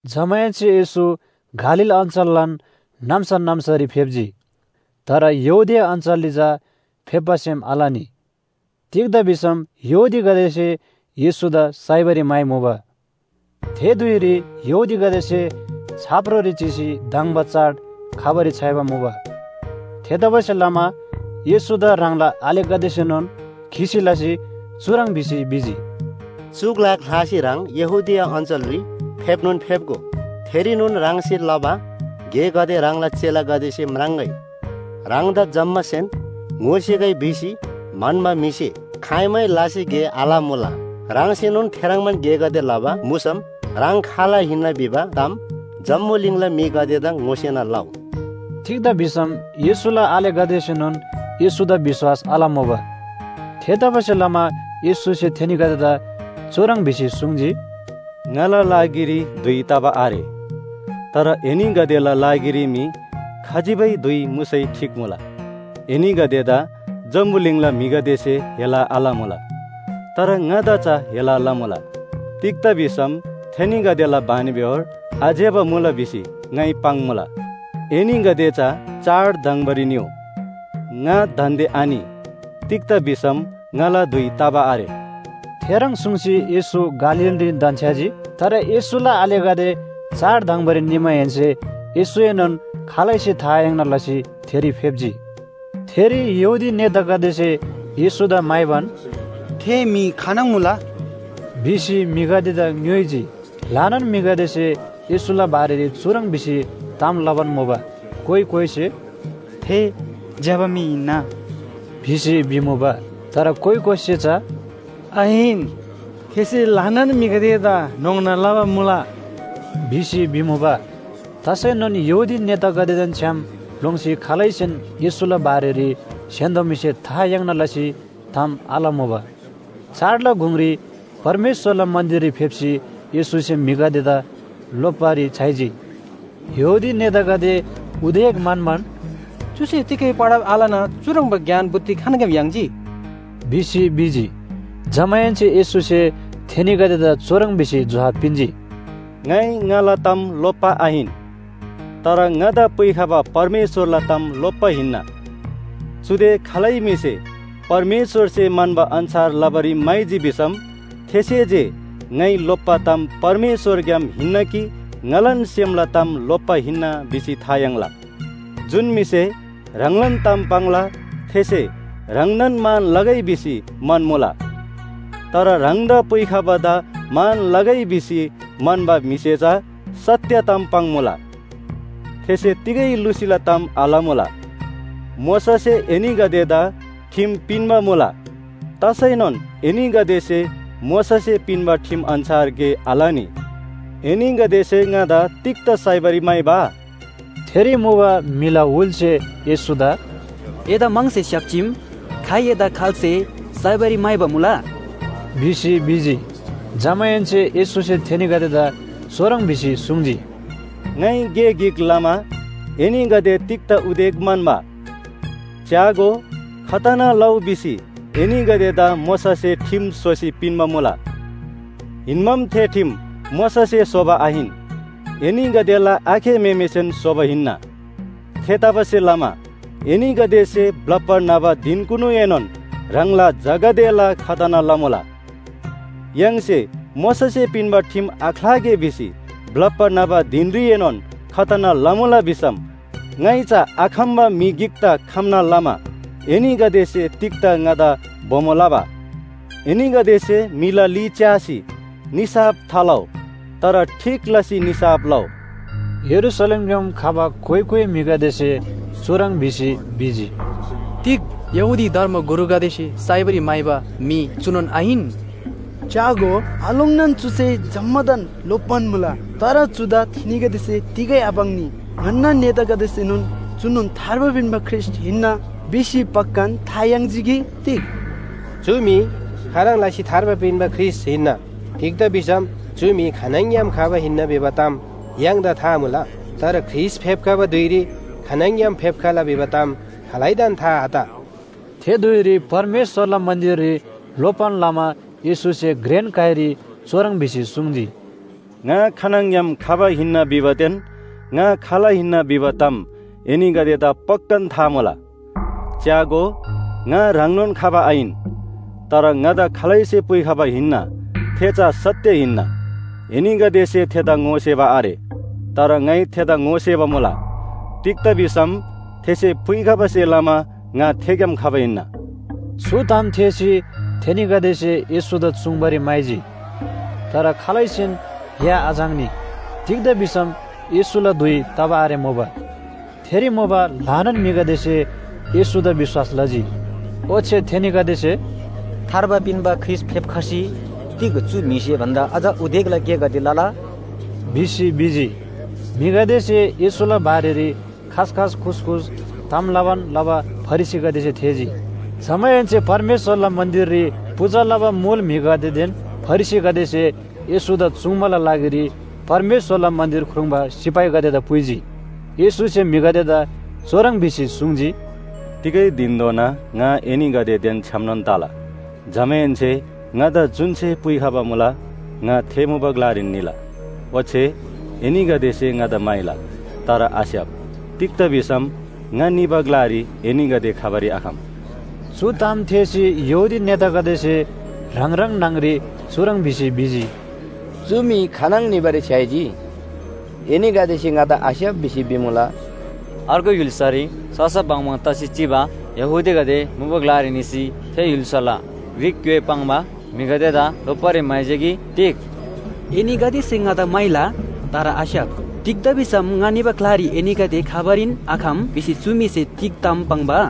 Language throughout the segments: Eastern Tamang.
जमाहेन्‍से येशू गालील अञ्‍चललान नाम्‍सा नाम्‍सारी फेप्‍जी, तर यहूदिया अञ्‍चलरी चा फेप्‍बा सेम आलनी। तिग्‍दा भिसम यहूदीगदेसे येशूदा साइबारी म्‍हाइमुबा। थे धुइरी यहूदीगदेसे छाप्रोरी चिसी धङ्बा चाड खबारी छ्‌याइबा मुबा। थेतबासेलमा येशूदा ह्राङला आलेगदेसेनोन खिसी लसी चुह्रङ् भिसी भिजी, “चु ग्‍ला ख्‍लासी ह्राङ यहूदिया अञ्‍चलरी फेप्‍नोन फेप्‍गो, थेरीनोन ह्राङसे लबा गेगदे ह्राङला चेलागदेसे म्राङ्‍गै। ह्राङदा जम्‍मासेन ङोसेगै भिसी म्‍हन्‍बा म्‍हिसे खाइमै लासी गे आलमुला। ह्राङसेनोन थेह्रङ्बान गेगदे लबा मुसम ह्राङ खाल हिन्‍ना भिबा ताम जम्‍बुलिङला म्‍हिगदेदा ङोसेना लउ।” तिग्‍दा भिसम येशूला आलेगदेसेनोन येशूदा विश्‍वास आलमुबा! थेतबासेलमा येशूसे थेनीगदेदा चुह्रङ् भिसी सुङ्जी, “ङाला लागिरी धुइ तबा आरे। तर एनीगदेला लागिरी मी खजिबै धुइ मुसै ठीक मुला। एनीगदेदा जम्‍बुलिङला म्‍हिगदेसे हेला आलमुला, तर ङादा चा हेला लमुला। तिग्‍दा भिसम थेनीगदेला बानीबेहोर आज्‍यबा मुला भिसी ङाइ पाङ्‌मुला। एनीगदे चा चाड धङ्बारी निउ, ङा दान्‍दे आनि। तिग्‍दा भिसम ङाला धुइ तबा आरे।” थेह्रङ् सुङ्सी येशू गालीलरीन धन्‍छ्‌याजी। तर येशूला आलेगदे चाड धङ्बारी निमाहेन्‍से येशूएनोन खालैसे था आयाङ्ना लसी थेरी फेप्‍जी। थेरी यहूदी नेतागदेसे येशूदा म्‍हाइबान, “थे म्‍हि खानङ मुला?” भिसी म्‍हिगदेदा ङ्‌योइजी। ल्‍हानान म्‍हिगदेसे येशूला बारेरी चुह्रङ् भिसी ताम लबान मुबा, कोइ कोइसे “थे ज्‍यबा म्‍हि हिन्‍ना” भिसी भिमुबा। तर कोइ कोइसे चा “आहिन, थेसे ल्‍हानान म्‍हिगदेदा न्‍होङ्ना लबा मुला” भिसी भिमुबा। तसैनोन यहूदी नेतागदेदेन छ्‌याम लोङ्सी खालैसेन येशूला बारेरी स्‍य्‍हान्‍दो म्‍हिसे था याङ्ना लसी ताम आलमुबा। चाडला गुङरी परमेश्‍वरला मन्‍दिररी फेप्‍सी येशूसे म्‍हिगदेदा लोप्‍बारी छ्‌याइजी। यहूदी नेतागदे उदेक म्‍हन्‍बान, “चुसे तिगै पढब आलना चुह्रङ्बा ज्ञान बुद्धि खानङग्‍याम याङ्जी?” भिसी भिजी। जमाहेन्‍से येशूसे थेनीगदेदा चुह्रङ् भिसी जोहाब पिन्‍जी, “ङाइ ङाला ताम लोप्‍बा आहिन, तर ङादा पुइखबा परमेश्‍वरला ताम लोप्‍बा हिन्‍ना। चुदे खालै म्‍हिसे परमेश्‍वरसे म्‍हन्‍बा अन्‍छार लबारी म्‍हाइजी भिसम थेसे जे ङाइ लोप्‍बा ताम परमेश्‍वरग्‍याम हिन्‍ना कि ङालान सेमला ताम लोप्‍बा हिन्‍ना भिसी था याङ्ला। जुन म्‍हिसे ह्राङलान ताम पाङ्ला थेसे ह्राङदान मान लगै भिसी म्‍हन्‍मुला। तर ह्राङदा पुइखबादा मान लगै भिसी म्‍हन्‍बा म्‍हिसे चा सत्‍य ताम पाङ्‌मुला, थेसे तिगै लुसीला ताम आलमुला। मोशासे एनीगदेदा ठिम पिन्‍बा मुला, तसैनोन एनीगदेसे मोशासे पिन्‍बा ठिम अन्‍छार गे आलनी। एनीगदेसे ङादा तिग्‍दा साइबारी म्‍हाइबा?” थेरी मुबा म्‍हिला हुलसे येशूदा “एदा म्‍हङसे स्‍याप्‍जीम, खाइ एदा खाल्‍से साइबारी म्‍हाइबा मुला?” भिसी भिजी। जमाहेन्‍से येशूसे थेनीगदेदा चुह्रङ् भिसी सुङ्जी, “ङाइ गे गिक लमा एनीगदे तिग्‍दा उदेक म्‍हन्‍बा? च्‍यागो, खतना लउ भिसी एनीगदेदा मोशासे ठिम स्‍होसी पिन्‍बा मुला। हिन्‍बाम थे ठिम मोशासे स्‍होबा आहिन, एनीगदेला आखे म्‍हेमेसेन स्‍होबा हिन्‍ना। थेतबासेलमा एनीगदेसे ब्‍लप्‍बा न्‍हबा धिनकुनुएनोन ह्राङला झागदेला खतना लमुला। य्‍हाङसे मोशासे पिन्‍बा ठिम आख्‍लागे भिसी ब्‍लप्‍बा न्‍हबा धिनरीएनोन खतना लमुला भिसम ङाइ चा आखम्‍बा म्‍हि गिकदा खम्‍ना लमा एनीगदेसे तिग्‍दा ङादा बोमो लबा? एनीगदेसे म्‍हिला ली च्‍यासी निसाफ थालउ, तर ठीक लसी निसाफ लउ।” यरूशलेमग्‍याम खबा कोइ कोइ म्‍हिगदेसे चुह्रङ् भिसी भिजी, “तिग यहूदी धर्मगुरुगदेसे साइबारी म्‍हाइबा म्‍हि चुनोन आहिन? च्‍यागो, आलोङ्नान चुसे जम्‍मादान लोप्‍बान मुला, तर चुदा थेनीगदेसे तिगै आपाङ्नी! ङन्‍ना नेतागदेसेनोन चुनोन थार्बा पिन्‍बा ख्रीष्‍ट हिन्‍ना भिसी पक्‍कान था याङ्जी कि तिग? चु म्‍हि खाह्रङ् लसी थार्बा पिन्‍बा ख्रीष्‍ट हिन्‍ना, तिग्‍दा भिसम चु म्‍हि खानङग्‍याम खबा हिन्‍ना भिबा ताम य्‍हाङदा था मुला। तर ख्रीष्‍ट फेप्‍खबा धुइरी खानङग्‍याम फेप्‍खला भिबा ताम खालैदान था आत। थे धुइरी परमेश्‍वरला मन्‍दिररी लोप्‍बान लमा येशूसे घ्रेन काइरी चुह्रङ् भिसी सुङ्जी, “ङा खानङग्‍याम खबा हिन्‍ना भिबादेन ङा खाल हिन्‍ना भिबा ताम एनीगदेदा पक्‍कान था मुला। च्‍यागो, ङा ह्राङनोन खबा आहिन, तर ङादा खालैसे पुइखबा हिन्‍ना थे चा सत्‍य हिन्‍ना, एनीगदेसे थेदा ङोसेबा आरे। तर ङाइ थेदा ङोसेबा मुला। तिग्‍दा भिसम थेसे पुइखबासे लमा ङा थेग्‍याम खबा हिन्‍ना।” चु ताम थेःसी थेनीगदेसे येशूदा चुङ्बारी म्‍हाइजी। तर खालैसेन या आझाङ्नी, तिग्‍दा भिसम येशूला धुइ तबा आरेमुबा। थेरी मुबा ल्‍हानान म्‍हिगदेसे येशूदा विश्‍वास लजी। ओच्‍छे थेनीगदेसे, “थार्बा पिन्‍बा ख्रीष्‍ट फेप्‍खसी, तिग चु म्‍हिसे भन्‍दा अझ उदेकला गेगदे लला?” भिसी भिजी। म्‍हिगदेसे येशूला बारेरी खासखास खुसखुस ताम लबान लबा फरिसीगदेसे थेःजी। जमाहेन्‍से परमेश्‍वरला मन्‍दिररी पूजा लबा मुल म्‍हिगदेदेन फरिसीगदेसे येशूदा चुङ्बाला लागिरी परमेश्‍वरला मन्‍दिर ख्रुङ्बा सिपाहीगदेदा पुइजी। येशूसे म्‍हिगदेदा चुह्रङ् भिसी सुङ्जी, “तिगै धिनधोना ङा एनीगदेदेन छ्‌यामनोन तला, जमाहेन्‍से ङादा जुन्‍से पुइखबा मुला, ङा थे मुबा ग्‍लारीन निला। ओच्‍छे एनीगदेसे ङादा म्‍हाइला, तर आस्‍याप। तिग्‍दा भिसम ङा निबा ग्‍लारी एनीगदे खबारी आखम।” चु ताम थेःसी यहूदी नेतागदेसे ह्राङ ह्राङ न्‍हङ‍री चुह्रङ् भिसी भिजी, “चु म्‍हि खानङ निबारी छ्‌याइजी? एनीगदेसे ङादा आस्‍याप भिसी भिमुला। अर्गु य्‍हुल्‍सारी ससा बङबङ तसी चिबा यहूदीगदे मुबा ग्‍लारी निसी थे य्‍हुल्‍साला ग्रीक ग्‍योइ पाङ्बा म्‍हिगदेदा लोप्‍बारी म्‍हाइजी कि तिग? ‘एनीगदेसे ङादा म्‍हाइला, तर आस्‍याप। तिग्‍दा भिसम ङा निबा ग्‍लारी एनीगदे खबारीन आखम’ भिसी चु म्‍हिसे तिग ताम पाङ्बा?”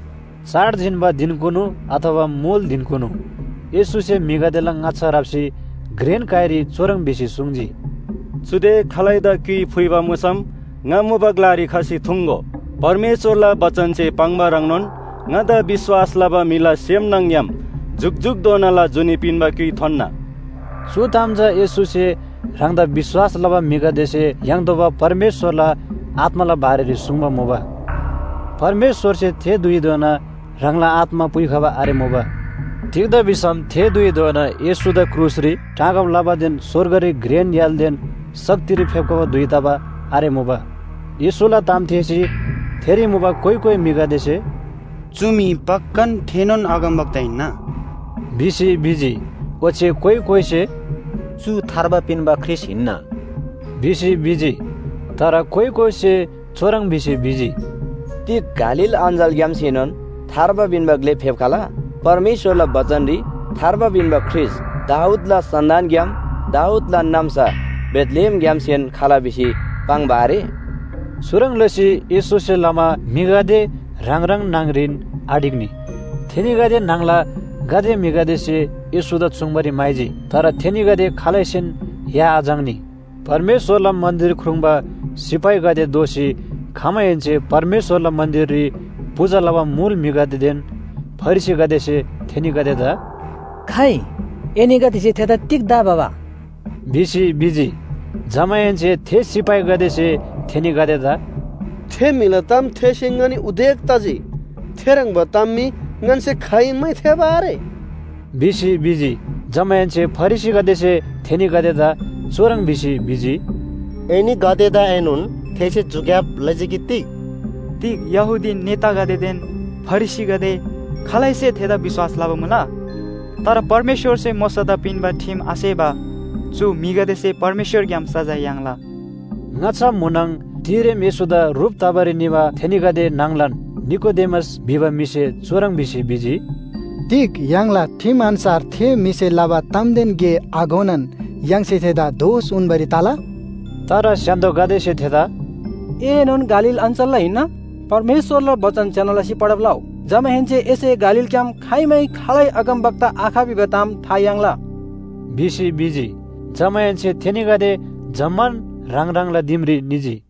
चाड जिन्‍बा धिनकुनु अथवा मुल धिनकुनु येशूसे म्‍हिगदेला ङाच्‍छा राप्‍सी घ्रेन काइरी चुह्रङ् भिसी सुङ्जी, “चुदे खालैदा क्‍युइ फुइबा मुसम ङा मुबा ग्‍लारी खसी थुङ्‍गो। परमेश्‍वरला बचनसे पाङ्बा ह्रङ्नोन ङादा विश्‍वास लबा म्‍हिला सेम न्‍हङ‍ग्‍याम जुकजुकधोनाला जुनी पिन्‍बा क्‍युइ थोन्‍ना।” चु ताम चा येशूसे ह्राङदा विश्‍वास लबा म्‍हिगदेसे याङ्तोःबा परमेश्‍वरला आत्‍माला बारेरी सुङ्बा मुबा। परमेश्‍वरसे थे धुइधोना ह्राङला आत्‍मा पुइखबा आरेमुबा। तिग्‍दा भिसम थे धुइधोना येशूदा क्रुसरी टाँगब लबादेन स्‍वर्गरी घ्रेन य्‍हालदेन शक्तिरी फेप्‍बा धुइ तबा आरेमुबा। येशूला ताम थेःसी थेरी मुबा कोइ कोइ म्‍हिगदेसे “चु म्‍हि पक्‍कान थेनोन अगमवक्ता हिन्‍ना” भिसी भिजी। ओच्‍छे कोइ कोइसे “चु थार्बा पिन्‍बा ख्रीष्‍ट हिन्‍ना” भिसी भिजी। तर कोइ कोइसे चुह्रङ् भिसी भिजी, “तिग गालील अञ्‍चलग्‍यामसेनोन थार्बा पिन्‍बा ग्‍ले फेप्‍खला? परमेश्‍वरला बचनरी थार्बा पिन्‍बा ख्रीष्‍ट दाऊदला सन्‍तानग्‍याम दाऊदलान नाम्‍सा बेथलेहेमग्‍यामसेन खला भिसी पाङ्बा आरे?” चुह्रङ् लसी येशूसे लमा म्‍हिगदे ह्राङ ह्राङ न्‍हङरीन आढिक्‍नी। थेनीगदे न्‍हङला गाते म्‍हिगदेसे येशूदा चुङ्बारी म्‍हाइजी। तर थेनीगदे खालैसेन या आझाङ्नी। परमेश्‍वरला मन्‍दिर ख्रुङ्बा सिपाहीगदे दोःसी खमाहेन्‍से परमेश्‍वरला मन्‍दिररी पूजा लबा मुल म्‍हिगदेदेन फरिसीगदेसे थेनीगदेदा “खाइ, एनीगदेसे थेदा तिग्‍दा आभबा?” भिसी भिजी। जमाहेन्‍से थे सिपाहीगदेसे थेनीगदेदा “थे म्‍हिला ताम थेःसी ङनी उदेक तजी। थेह्रङ्बा ताम मी ङन्‍से खाइमै थेःबा आरे” भिसी भिजी। जमाहेन्‍से फरिसीगदेसे थेनीगदेदा चुह्रङ् भिसी भिजी, “एनीगदेदाएनोन थेसे झुक्‍याब लजी कि तिग? तिग यहूदी नेतागदेदेन फरिसीगदे खालैसे थेदा विश्‍वास लबा मुला? तर परमेश्‍वरसे मोशादा पिन्‍बा ठिम आसेबा चु म्‍हिगदेसे परमेश्‍वरग्‍याम सजाय याङ्ला।” ङाच्‍छा म्‍हुनङ तिरेम येशूदा ह्रुप तबारी निबा थेनीगदे न्‍हङलान निकोदेमस भिबा म्‍हिसे चुह्रङ् भिसी भिजी, “तिग य्‍हाङला ठिम अन्‍छार थे म्‍हिसे लबा तामदेन गे आघोनान य्‍हाङसे थेदा दोष उन्‍बारी तला?” तर स्‍य्‍हान्‍दोगदेसे थेदा “एएनोन गालील अञ्‍चलला हिन्‍ना? परमेश्‍वरला बचन ज्‍यना लसी पढब लउ। जमाहेन्‍से एसे गालीलग्‍याम खाइमै खालै अगमवक्ता आख भिबा ताम था याङ्ला” भिसी भिजी। जमाहेन्‍से थेनीगदे जम्‍मान ह्राङ ह्राङला दिमरी निजी।